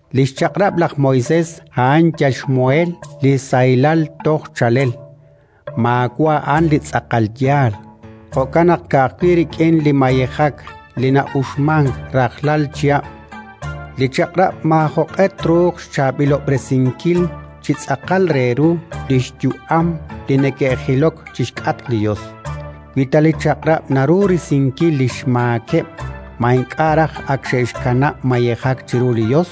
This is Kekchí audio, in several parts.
Li xChaq'rab' laj Moisés a'an yal xmuheel li sahilal toj chaalel, maawa' a'an li tz'aqal yaal. Jo'kan naq, ka'ajwi' rik'in li mayejak li na'uxmank rajlal chihab', li Chaq'rab' maajoq'e truuq xchaab'ilob'resinkil chi tz'aqal re ru li xyu'ameb' li neke'jilok chi xk'atq li Yos. Wi ta li Chaq'rab' naru risinkil li xmaakeb', ma ink'a' raj ak xe'xkanab' mayejak chiru li Yos?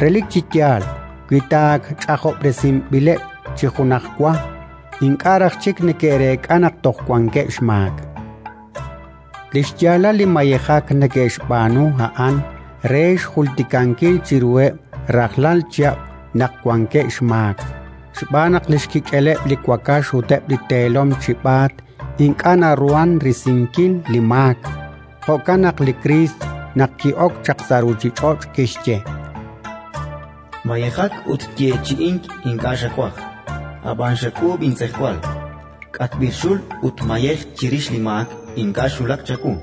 Relik chi yaal, wi ta ak ch'ajob'resinb'ileb' chi junajwa, ink'a' raj chik neke'reek'a naq toj wankeb' xmaak. Li xyaalal li mayejak neke'xb'aanu, a'an re xjultikankil chiruheb' rajlal chihab' naq wankeb' xmaak, xb'aan naq li xkik'eleb' li wakax ut eb' li teelom chib'aat ink'a' naruhank risinkil li maak. Jo'kan naq li Kriist, naq ki'ok chaq sa' ruuchich'och', kixye: “Mayejak ut yeechi'ink ink'a' xawaj; ab'an xak'uub' intz'ejwal. K'atb'il xul ut mayej chirix li maak ink'a' xwulak chawu.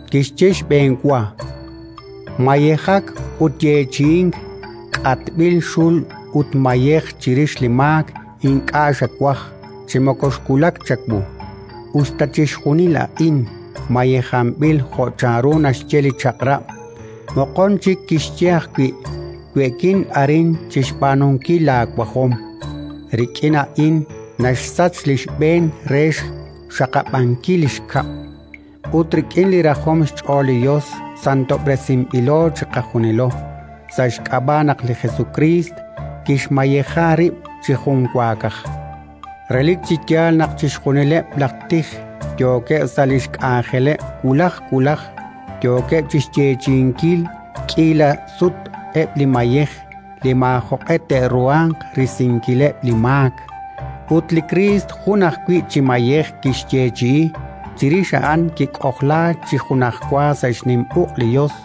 Kixye xb'enwa: “Mayejak ut yeechi'ink, k'atb'il xul ut mayej chirix li maak ink'a' xawaj chi moko xwulak chawu”, us ta chixjunil a'in mayejanb'il jo' chanru naxye li Chaq'rab'. Moqon chik kixye ajwi': “We'kin arin chi xb'aanunkil laawajom”. Rik'in a'in naxsach li xb'een re xxaqab'ankil li xkab'. Ut rik'in li rajom xch'ool li Yos santob'resinb'ilo chiqajunilo sa' xk'ab'a' naq li Jesukriist kixmayeja rib' chi junwaakaj. Relik chi yaal naq chixjunileb' laj tij yookeb' sa' li xk'anjeleb' wulaj wulaj, yookeb' chi xyeechi'inkil k'iila sut eb' li mayej li maajoq'e te'ruhanq risinkileb' li maak. Ut li Kriist jun ajwi' chi mayej kixyeechi'i; chirix a'an kik'ojlaak chi junajwa sa' xnim uq' li Yos,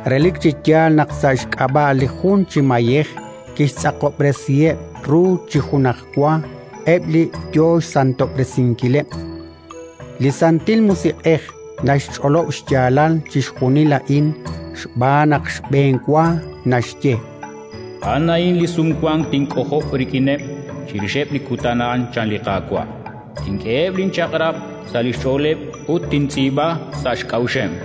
Relik chi yaal naq sa' xk'ab'a' li jun chi mayej kixtz'aqob'resiheb' ru chi junajwa eb' li yo xsantob'resinkileb'. Li Santil Musiq'ej naxch'olob' xyaalal chixjunil a'in, xb'aan naq xb'enwa naxye: “A'an a'in li Sumwank tink'ojob' rik'ineb', chirixeb' li kutan a'an, chan li Qaawa': Tink'eheb' linchaq'rab' sa' li xch'ooleb', ut tintz'iib'a sa' xk'a'uxeb'”.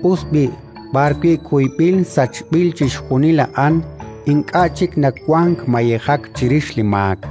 Us b'i', b'arwi' kuyb'il sachb'il chixjunil a'an, ink'a' chik nawank mayejak chirix li maak.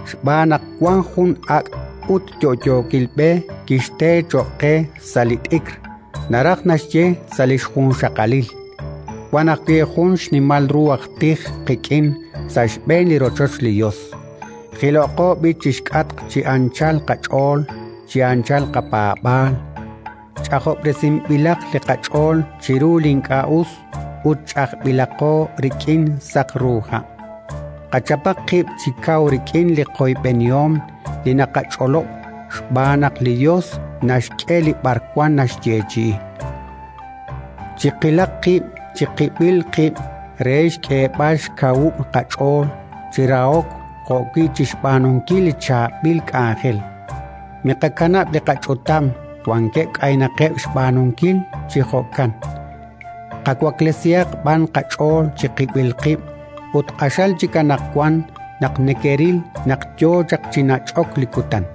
xb'aan naq wank jun ak' ut yo'yookil b'e kixte cho'q qe sa' li t'ikr, naraj naxye sa' li xjunxaqalil. Wank ajwi' jun xnimal ru aj tij qik'in sa' xb'een li rochoch li Yos. Jiloqo b'i' chi xk'atq chi anchal qach'ool, chi anchal qapaab'aal, ch'ajob'resinb'ilaq li qach'ool chiru li ink'a' us ut ch'ajb'ilaqo rik'in saq ru ha'. Qachapaq qib' chi kaw rik'in li qoyb'enihom li naqach'olob', xb'aan naq li Yos naxk'e li b'arwan naxyeechi'i. Chiqilaq qib' chiqib'il qib' re xk'eeb'al xkawub' qach'ool chi rahok jo'wi' chi xb'aanunkil li chaab'il k'anjel. Miqakanab' li qach'utam: wankeb' k'aynaqeb' xb'aanunkil chi jo'kan. Qawaklesihaq b'an qach'ool chiqib'il qib', ut q'axal chik anaqwan naq nekeril naq yo chaq chi nach'ok li Kutan.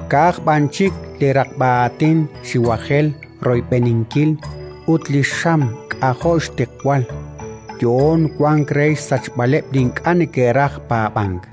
ka'aj b'an chik li raqb'a aatin xiwajel royb'eninkil ut li xam k'ajo' xtiqwal, yo'oon wank re xsachb'aleb' li ink'a' neke'raj paab'ank.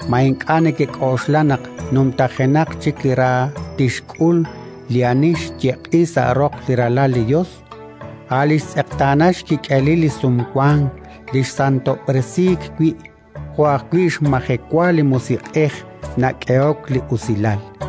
Ma ink'a' nekek'oxla naq numtajenaq chik ra tixk'ul li ani xyeq'i sa' roq li Ralal li Yos, a' li xtz'eqtaana xkik'elil li Sumwank li xsantob'resiik wi', jo' ajwi' xmajewa li Musiq'ej nak'ehok li usilal?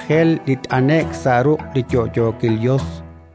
Q'axal xiwajel li t'ane'k sa' ruq' li yo'yookil Yos!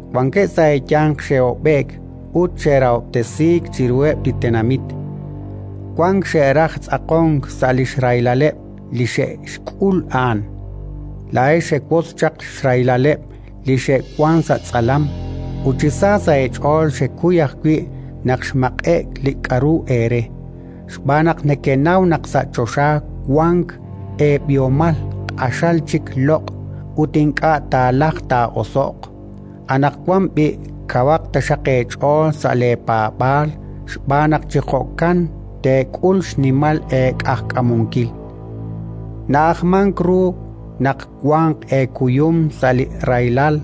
Wankeb' sa' eeyanq xe'hob'e'k ut xe'rahob'tesiik chiruheb' li tenamit. Wank xe'raj tz'aqonk sa' li xrahilaleb' li xe'xk'ul a'an. Laa'ex xewotz chaq xrahilaleb' li xe'wank sa' tz'alam, ut chi sa sa' eech'ool xekuy ajwi' naq xmaq'e'k li k'aru eere, xb'aan naq nekenaw naq sa' choxa wank eeb'ihomal q'axal chik loq' ut ink'a' taalajq taa'oso'q. Anaqwan b'i', kawaq taxaq eech'ool sa' leepaab'aal xb'aan naq chi jo'kan teek'ul xnimal eeq'ajkamunkil. Na'ajmank ru naq wanq eekuyum sa' li rahilal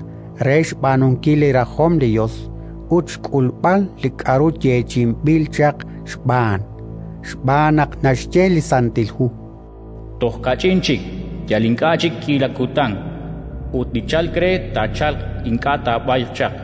re xb'aanunkil li rajom li Yos ut xk'ulb'al li k'aru yeechi'inb'il chaq xb'aan. Xb'aan naq naxye li Santil Hu: “Toj kach'in chik, yal ink'a' chik k'iila kutan, ut li chalk re taachalq, ink'a' taab'ayq chaq.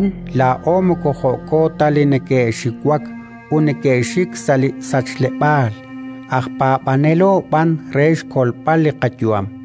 Ab'anan laa'o moko jo'ko ta li neke'xiwak ut neke'xik sa' li sachleb'aal, aj paab'anelo b'an re xkolb'al li qayu'am.